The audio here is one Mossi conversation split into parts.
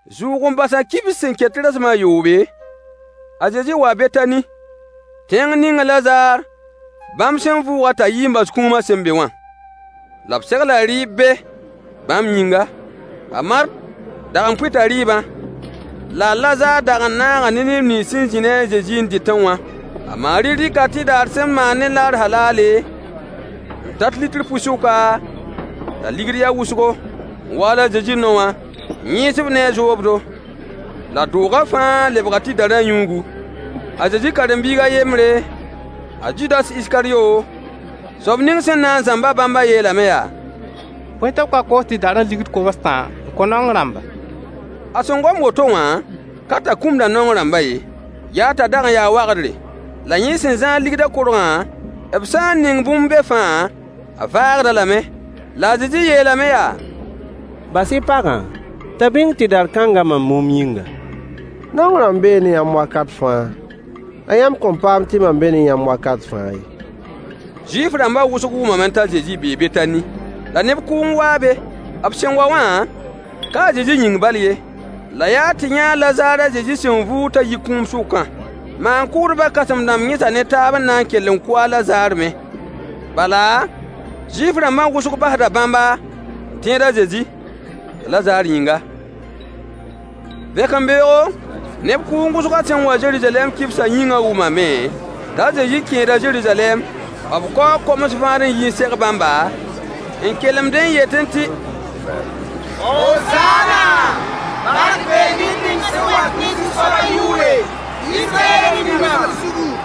Zʋʋg-n-basã kibs sẽn ket tɩ rasem a yoobe, a Zezi waa Betani, tẽng ning a Lazaar bãmb sẽn vʋʋg-a t'a yi n bas kũumã sẽn be wã. La b segla rɩɩb be bãmb yĩnga. A Mart dag n pʋɩta rɩɩbã, la a Lazaar dag n naaga ne neb nins sẽn zĩ ne a Zezi n dɩtẽ wã. A Maari dɩka tɩdar sẽn maan ne naar halaale, n tat litr pʋɩ-sʋka, t'a ligd ya wʋsgo, n waal a Zezi nao wã, n yẽes-b ne a zoobdo. La doogã fãa lebga tɩdarã yũugu. A Zezi karen-biig a yembre, a Zudas Iskaryo, soab ning sẽn na n zãmb-a bãmbã yeelame yaa: Bõe tɩ b ka koos tɩdarã deniye kobs-tã n kõ naong rãmba? A sẽn gom woto wã, ka t'a kʋmda naong rãmbã ye. Yaa t'a dag n yaa wagdre, la yẽ sẽn zãad ligdã korgã, b sã n ning bũmb be fãa, a vaagd-a lame. La a Zezi yeelame yaa: Bas-y pagã t'a bĩng tɩdar-kãngã mam mumb yĩnga. Naong rãmbã bee ne yãmb wakat fãa, la yãmb kõn paam tɩ mam be ne yãmb wakat fãa ye. Zuif-rãmbã wʋsg wʋmame t'a Zezi bee Betani, la neb kʋʋng waa be. B sẽn wa wã, ka a Zezi yĩng bal ye, la yaa tɩ yã a Lazaar a Zezi sẽn vʋʋg t'a yi kũum sʋkã. Maan-kʋʋdbã kãsem-dãmb yẽsa ne taab n na n kell n kʋ a Lazaar me, bala, Zuif-rãmbã wʋsg basda bãmba n tẽed a Zezi, a Lazaar yĩnga. Vẽkembeoogo, neb kʋʋng wʋsgã sẽn wa Zeruzalɛm kibsã yĩngã wʋmame t'a Zezi kẽeda Zeruzalɛm. B kaoo koms vãad n yi n seg bãmba, n kelemdẽ n yetẽ tɩ: Hozaana, bark bee ned ning sẽn wat ne Zu-soabã yʋʋre, Israyɛll Rĩmã zugu.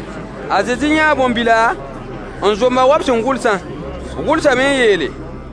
A Zezi yãa bõn-bila, n zomb-a wa b sẽn gʋlsã. B gʋlsame n yeele: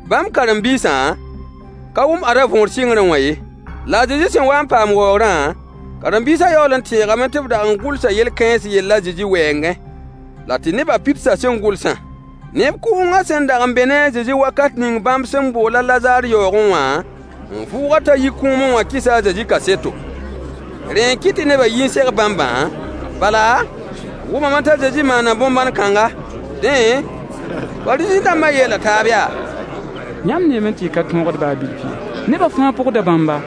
Bãmb karen-biisã ka wʋm ada võor sɩngrẽ wã ye. La a Zezi sẽn wa n paam waoogrã, karen-biisã yaool n tẽegame tɩ b dag n gʋlsa yel-kãens yell a Zezi wɛɛngẽ, la tɩ nebã pidsa sẽn gʋlsã. Neb kʋʋngã sẽn dag n be ne a Zezi wakat ning bãmb sẽn bool a Lazaar yaoogẽ wã, n vʋʋg-a t'a yi kũumẽ wã kɩsa a Zezi kaseto. Rẽ n kɩt tɩ nebã yi n seg bãmbã, bala, b wʋmame t'a Zezi maana bõn-bãn kãnga. Dẽ, Fariisẽ-dãmbã yeela taab yaa: Yãmb neeme tɩ y ka tõogd baa bilf ye. Nebã fãa pʋgda bãmba.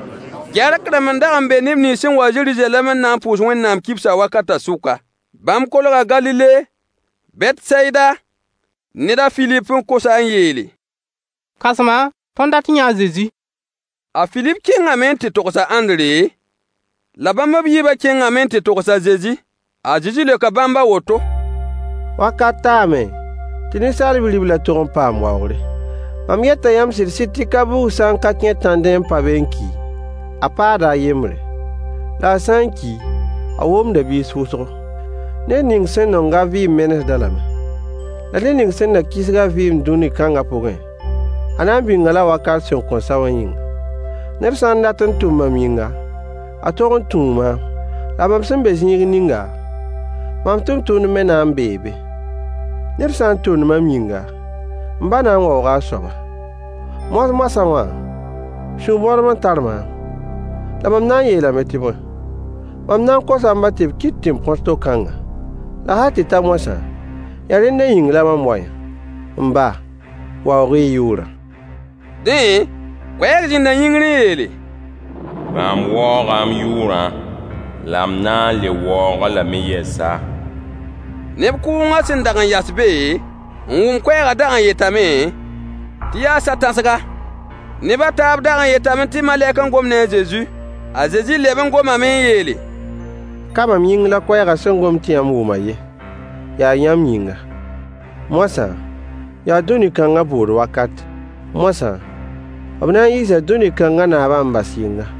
Gɛrk-rãmb n dag n be neb nins sẽn wa Zeruzalɛm n na n pʋʋs Wẽnnaam kibsã wakatã sʋka. Bãmb kolga Galile Betsayida ned a Filip n kos-a n yeele: Kãsma, tõnd dat n yãa a Zezi. A Filip kẽngame n tɩ togs a Ãndre, la bãmb b yiibã kẽngame n tɩ togs a Zezi. A Zezi leoka bãmb a woto: Wakat taame tɩ Ninsaal Bi-riblã tog n paam waoogre. Mam yeta yãmb sɩd-sɩd tɩ ka-buug sã n ka kẽ tãndẽ n pa be n ki, a paada a yembre. La a sã n ki, a womda biis wʋsgo. Ned ning sẽn nong a vɩɩm menesd-a lame. La ned ning sẽn na kisg a vɩɩm dũni kãngã pʋgẽ, a na n bĩng-a lame wakat sẽn kõn sa wã yĩnga. Ned sã n dat n tʋm mam yĩnga, a tog n tũu maam. La mam sẽn be zĩig ninga, mam tʋmtʋmd me na n bee be. Ned sã n tʋmd mam yĩnga, m ba na n waooga a soaba. Moas-moasã wã, sũ-bõdem n tar maam. La mam na n yeelame tɩ bõe? Mam na n kosa m ba tɩ b kɩt tɩ m põs to-kãngã? La hal tɩ ta moasã, yaa rẽnda yĩng la mam wa-yã. M ba, waoog-y y yʋʋrã! Dẽ, koɛɛg zĩnda yĩngr n yeele: Mam waooga m yʋʋrã, la m na n le waoog-a lame yɛsa. Neb kʋʋngã sẽn dag n yas be, n wʋm koɛɛgã dag n yetame tɩ yaa sa-tãsga. Neb a taab dag n yetame tɩ malɛk n gom ne a Zezi. A Zezi leb n gomame n yeele: Ka mam yĩng la koɛɛgã sẽn gom tɩ yãmb wʋmã ye, yaa yãmb yĩnga. Moasã yaa dũni kãngã bʋʋd wakate. Moasã, b na n yiisa dũni kãngã naabã n bas yɩnga.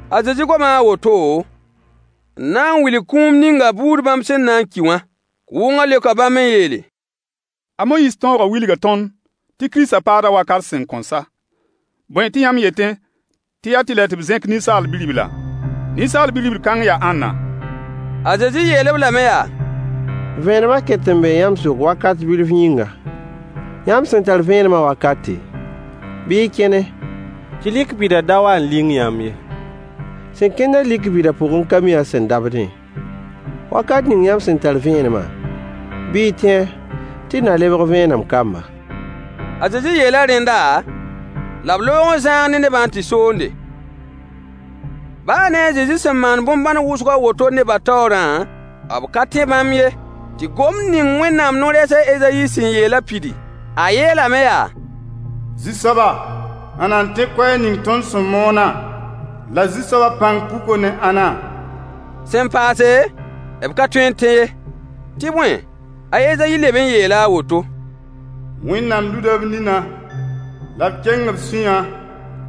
A Zezi goma a woto n na n wilg kũum ninga buud bãmb sẽn na n ki wã. Kʋʋngã leoka bãmb n yeele: A Moyiis tõogã wilga tõnd tɩ Kiristã paada wakat sẽn kõn sa. Bõe tɩ yãmb yetẽ tɩ yaa tɩlɛ tɩ b zẽk Ninsaal Bi-ribla? Ninsaal Bi-ribl kãng yaa ãnna? A Zezi yeel-b lame yaa: Vẽenemã ket n bee yãmb sʋk wakat bilf yĩnga. Yãmb sẽn tar vẽenemã wakate, bɩ y kẽne, tɩ lik bida da wa n ling yãmb ye. Sẽn kẽnd-a lik bida pʋgẽ ka mi a sẽn dabdẽ ye. Wakat ning yãmb sẽn tar vẽenemã, bɩ y tẽ-a, tɩ y na lebg vẽenem kamba. A Zezi yeela rẽnda, la b loog n zãag ne nebã n tɩ soonde. Baa ne a Zezi sẽn maan bõn-bãn wʋsg a woto nebã taoorã, b ka tẽ bãmb ye, tɩ gomd ning Wẽnnaam no-rɛɛs a Ezayi sẽn yeelã pidi. A yeelame yaa: Zu-soaba, ãnna n tẽ koɛɛg ning tõnd sẽn moonã? La Zu-soabã pãng puka ne ãnna? Sẽn paase, b ka tõe n tẽ ye, tɩ bõe, a Ezayi leb n yeela a woto: Wẽnnaam luda b ninã, la b keng b sũyã,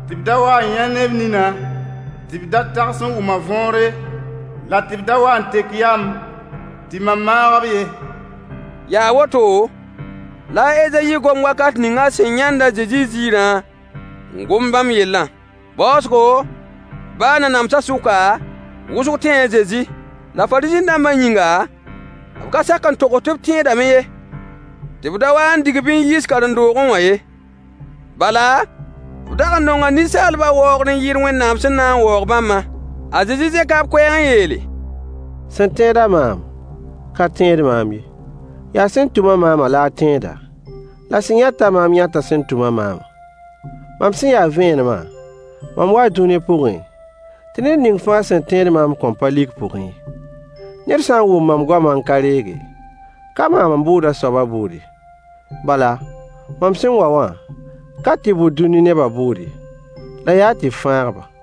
tɩ b da wa n yã ne b ninã, tɩ b da tags n wʋm a võore, la tɩ b da wa n tek yam, tɩ mam maag-b ye. Yaa woto la a Ezayi gom wakat ning a sẽn yãnd a Zezi ziirã n gom bãmb yellã. Baoosgo, baa nanamsã sʋka, wʋsg tẽe a Zezi, la Fariisẽ-dãmbã yĩnga, b ka sak n togs tɩ b tẽedame ye, tɩ b da wa n dig-b n yiis karen-doogẽ wã ye. Bala, b dag n nonga ninsaalbã waoogr n yɩɩd Wẽnnaam sẽn na n waoog bãmbã. A Zezi zẽka b koɛɛg n yeele: Sẽn tẽed-a maam ka tẽed maam ye, yaa sẽn tʋm-a maamã la a tẽeda, la sẽn yãt-a maam yãta sẽn tʋm-a maamã. Mam sẽn ya vẽenemã, mam waa dũni pʋgẽ, tɩ ned ning fãa sẽn tẽed maam kõn pa lik pʋgẽ ye. Ned sã n wʋm mam goamã n ka reege, ka maam n bʋʋd a soabã bʋʋd ye: Bala, mam sẽn wa wã, ka tɩ bʋ dũni nebã bʋʋd ye, la yaa tɩ fãag-ba.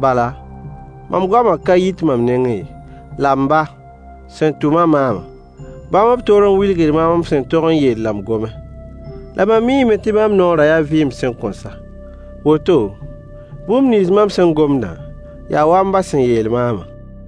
Bala, mam goamã ka yit mam nengẽ ye. La m ba, sẽn tʋm-a maamã, bãmb b toor n wilg maam m sẽn tog n yeel la m gome. La mam miime tɩ bãmb noorã yaa vɩɩm sẽn kõn sa. Woto, bũmb nins mam sẽn gomdã, yaa wa m ba sẽn yeel maamã.